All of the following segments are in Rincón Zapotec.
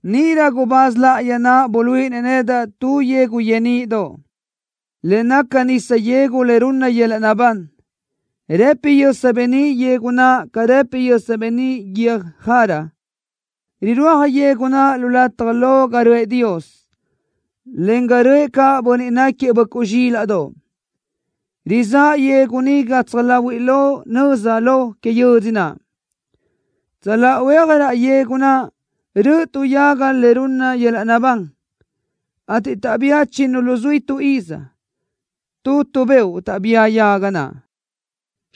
Níʼirö gubáz láʼayi naʼ buluíʼinëʼ nedaʼ tu yegu yeníʼidoʼ, le naca nisa yegu le runna yöl-laʼ naʼbán. Rëpi yösa beníʼ yegu naʼ ca rëpi yösa beníʼ guiö́j jara. Rirúaj yegu naʼ lu lataj lo ga röʼë Dios, en ga röʼë caʼ Bönniʼ náquiëʼ Böʼcuʼ Zxílaʼdoʼ. Rizáʼ yegu ni gatsaj láhuiʼlö nöza lo que yödzö naʼ. Tsöláʼa huéaj raʼ yegu naʼ röʼö tu yaga le runna yöl-laʼ naʼbán, ateʼ taʼbía chinnu luzuí tu iz. Tu tu beoʼ taʼbía yaga naʼ.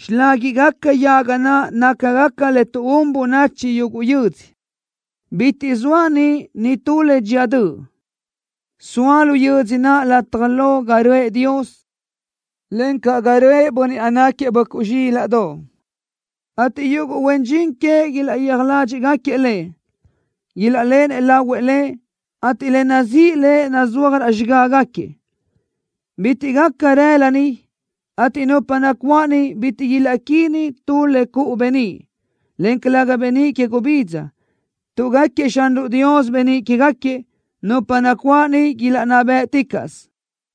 Xiláguiʼgaca yaga naʼ nácagaca le tuʼún bönachi yuguʼ yödzö. Bitiʼ soa niʼ nitú le dxía döʼ. Soa lu yödzö naʼ lataj lo ga röʼë Dios, encaʼ ga röʼë Bönniʼ náquiëʼ Böʼcuʼ Zxílaʼdoʼ, ateʼ yuguʼ huen dxin queëʼ ilaʼyéaj ládxiʼgaquiëʼ Lëʼ. Ilaʼléʼenëʼ lahuëʼ Lëʼ, ateʼ le nazíʼi Lëʼ nazúaj raʼ xigágaquiëʼ. Bitiʼ gaca rëla niʼ, ateʼ nupa nacuáʼ niʼ bitiʼ ilaʼquínna tu le cuʼu beníʼ, en calëga beníʼ que gubidza, tuʼ gáquiëʼ Xanruʼ Dios beníʼ quégaquiëʼ. Nupa nacuáʼ niʼ ilaʼnná bë́ʼticaʼsö.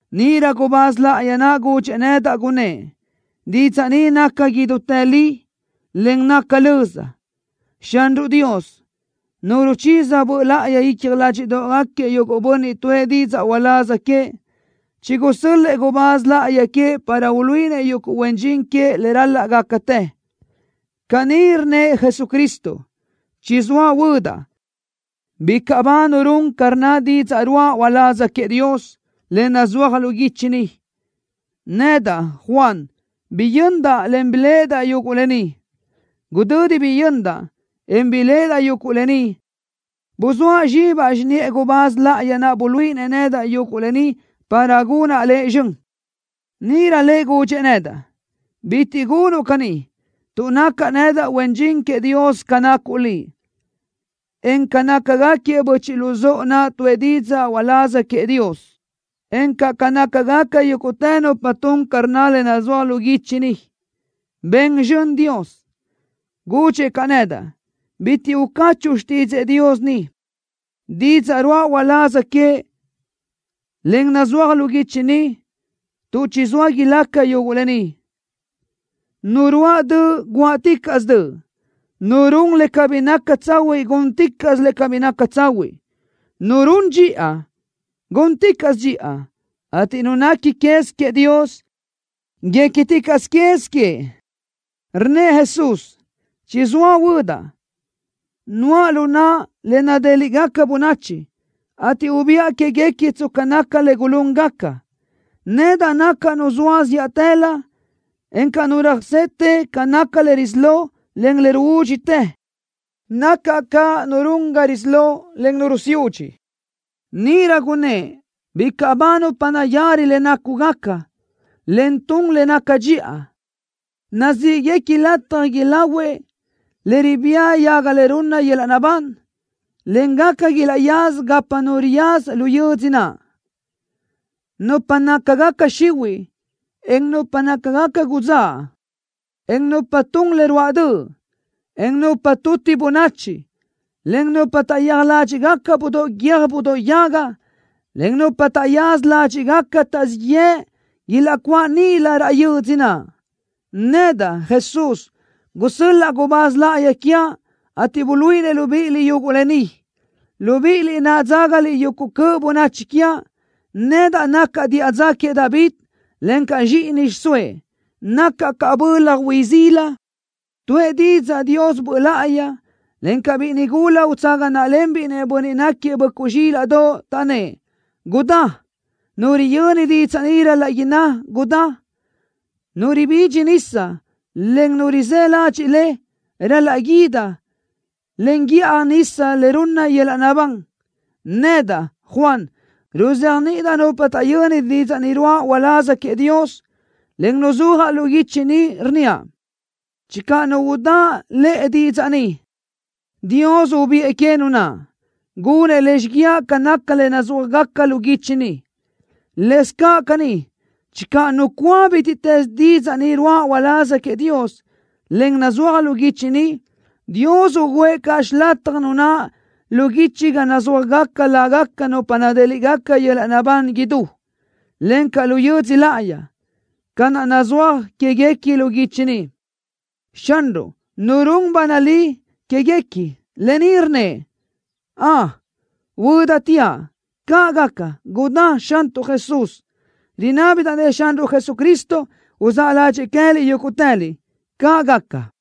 Níʼirö gubáz láʼayi naʼ gudxëʼ nedaʼ, gunnë́ʼ: “Didzaʼ ni naca idútë li, en naca löza. Xanruʼ Dios, Nu ruchiza Böʼ Láʼayi icja ládxiʼdoʼgaquiëʼ yuguʼ bönniʼ tuʼë didzaʼ uláz queëʼ, chigusö́l-lëʼë gubáz láʼayi queëʼ para uluíʼinëʼ yuguʼ huen dxin queëʼ le ral-laʼ gácatë. Caní rnnëʼ Jesucristo: ¡Chizóa huödaʼ! ¡Bicaʼ ba nu run ca rnna didzaʼ ruáʼa uláz queëʼ Dios, le nazúaj lu guichi ni!” Nedaʼ, Juan, biyöndaʼ, en biléʼedaʼ yuguʼ lë ni. Gudödi biyöndaʼ, en biléʼedaʼ yuguʼ lë ni, buzóa zxibaʼ xiniʼë gubáz láʼayi naʼ buluíʼinëʼ nedaʼ yuguʼ lë ni para gunaʼ lëʼ zxön. Níʼirö lëʼ gudxëʼ nedaʼ: “Bitiʼ gunuʼ caní, tuʼ nacaʼ nedaʼ huen dxin queëʼ Dios ca nacuʼ liʼ, en ca nácagaquiëʼ böchiʼ luzóʼo naʼ tuʼë didzaʼ uláz queëʼ Dios, encaʼ ca nácagaca yúguʼtë nupa tun ca rnna le nazúaj lu guichi ni. ¡Ben zxön Dios!” Gudxëʼ caʼ nedaʼ: “Bitiʼ ucachuʼu xtídzëʼë Dios ni, didzaʼ ruáʼa uláz queëʼ, en nazúaj lu guichi ni, tuʼ chizóa ilaca yuguʼ lë ni. Nu ruáʼ döʼ guáʼticaʼsö döʼ. Nu run le cabí naca tsahuiʼ gúnticaʼsö le cabí naca tsahuiʼ. Nu run dxiʼa, gúnticaʼsö dxiʼa, ateʼ nu nequi quez queëʼ Dios, guéquiticaʼsö quez queëʼ.” Rnnëʼ Jesús: “¡Chizóa huödaʼ! Nuʼa lu naʼa le nadéliʼgaca bönachi, ateʼ ubiʼa que queë́guequi tsca naca le gulúngaca. Nedaʼ nacaʼ Nu zoa zíʼatëlö, encaʼ Nu röjsete, ca naca le risí lo, en le ruúdxitë. Nacaʼ caʼ Nu run ga risí lo, en Nu rusiúdxi.” Níʼirö gunnë́ʼ: “¡Bicaʼ ba nupa nayari le nácugaca, en tun le naca dxiʼa! ¡Nazíʼguequi lataj ilahuëʼ le ribía yaga le runna yöl-laʼ naʼbán, en gaca ilaʼyaza gapa nu riyaza lu yödzö naʼ! Nupa nácagaca xihuiʼ, en nupa nácagaca udzáʼ, en nupa tun le ruáʼ döʼ, en nupa tuti bönachi, en nupa taʼyéaj ládxiʼgaca budóʼ guiö́j budóʼ yaga, en nupa taʼyaza ládxiʼgaca taʼzíʼ yëʼ ilaʼcuáʼ níʼilö raʼ yödzö naʼ. Nedaʼ, Jesús, gusö́l-laʼa gubáz láʼayi quiaʼ, ateʼ buluíʼinëʼ libíʼiliʼ yuguʼ lë ni, libíʼiliʼ naʼ dzágaliʼ yuguʼ cöʼ bönachi quiaʼ. Nedaʼ nacaʼ diʼa dza queëʼ David, encaʼ zxíʼini xiʼsóëʼ. Nacaʼ caʼ bölaj hui sila.” Tuʼë didzaʼ Dios Böʼ Láʼayi, encaʼ biʼi nigula utsaga náʼalenbiʼ-nëʼ Bönniʼ náquiëʼ Böʼcuʼ Zxílaʼdoʼ, taʼnnë́ʼ: “¡Gudá!” Nu riyöni didzaʼ ni ral-laʼ inná: “¡Gudá!” ¡Nu ribidxi nisa, en nu rizë́ ladxiʼ le, ral-laʼ guídi, en guíʼaj nisa le runna yöl-laʼ naʼbán! Nedaʼ, Juan, ruzéajniʼidaʼ nupa taʼyöni didzaʼ ni ruáʼa uláz queëʼ Dios, en nazúaj lu guichi ni, rnníaʼ: Channö nu udáʼ lëʼe didzaʼ ni, Dios ubiʼë que nu naʼ. Gunëʼ lëʼ xíguiaʼ ca naca le nazúajgaca lu guichi ni. Lëscaʼ caní, channö nu cúa bítiʼtës didzaʼ ni ruáʼa uláz queëʼ Dios, en nazúaj lu guichi ni, Dios ugǘëʼ caʼ xilataj nu naʼ lu guichi ga nazúajgaca lágaca nupa nadéliʼgaca yöl-laʼ naʼbán idú, encaʼ lu yödzö láʼayi, ca naʼ nazúaj quéguequi lu guichi ni. Xanruʼ, Nu run ba nalí quéguequi lë ni rnnëʼ: “¡Ön! ¡Huödateaʼ!” ¡Caʼ gaca! ¡Gudá, Xantuʼ Jesús! Rinábidaʼ-nëʼ Xanruʼ Jesucristo uzáʼ ládxëʼë queë́liʼ yúguʼtëliʼ. ¡Caʼ gaca!